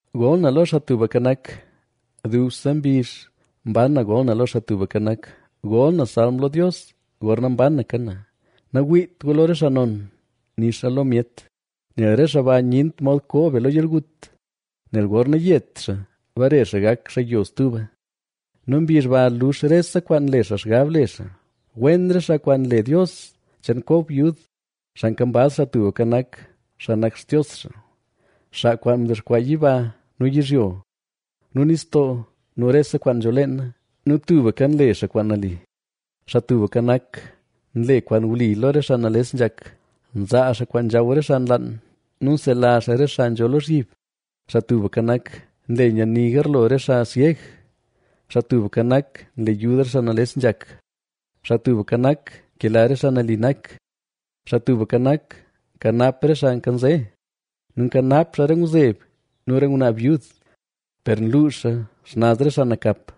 Gol na lo Xaa Tubka Nak. Dubse mbizh mban na gol na lo Xaa Tubka Nak; gol na salm lo Dios gorna mbanaka na. Nawiit gu lo re xaa non, nixa lo myet, nel re xaa ba nyent mod koo be lo yalgut. Nel gorna yet xaa bare xaa gak xaa yo stuba nu mbizh ba lux rese kwaan nle xaa xgab le xaa. Wen re xaa kwaan nle Dios cheen Kob yud, xaa nkambaz Xaa Tubka Nak, xaa nak Xtios xaa, xaa kwaan mdexkwaa yiba nu yizhyo nu nistoo nu rese kwaan nzho leena nu tubka nle xaa kwaan nali. Xaa Tubka Nak, nle kwaan wli lo re xaa nales nzhak, nzaa xaa kwaan nzhaw re xaa nlaan nu nsela xaa re xaa nzho lozhyib. Xaa Tubka Nak, nle nyani garlo re xaa syeg; Xaa Tubka Nak, nle yud re xaa nales nzhak; Xaa Tubka Nak, nkela re xaa nali nak. Xaa Tubka Nak, nkanap re xaa nkanze nu nkanap xaa re ngwzeb nu re ngwnaa byud, per nluux xaa xnaz re xaa nakap.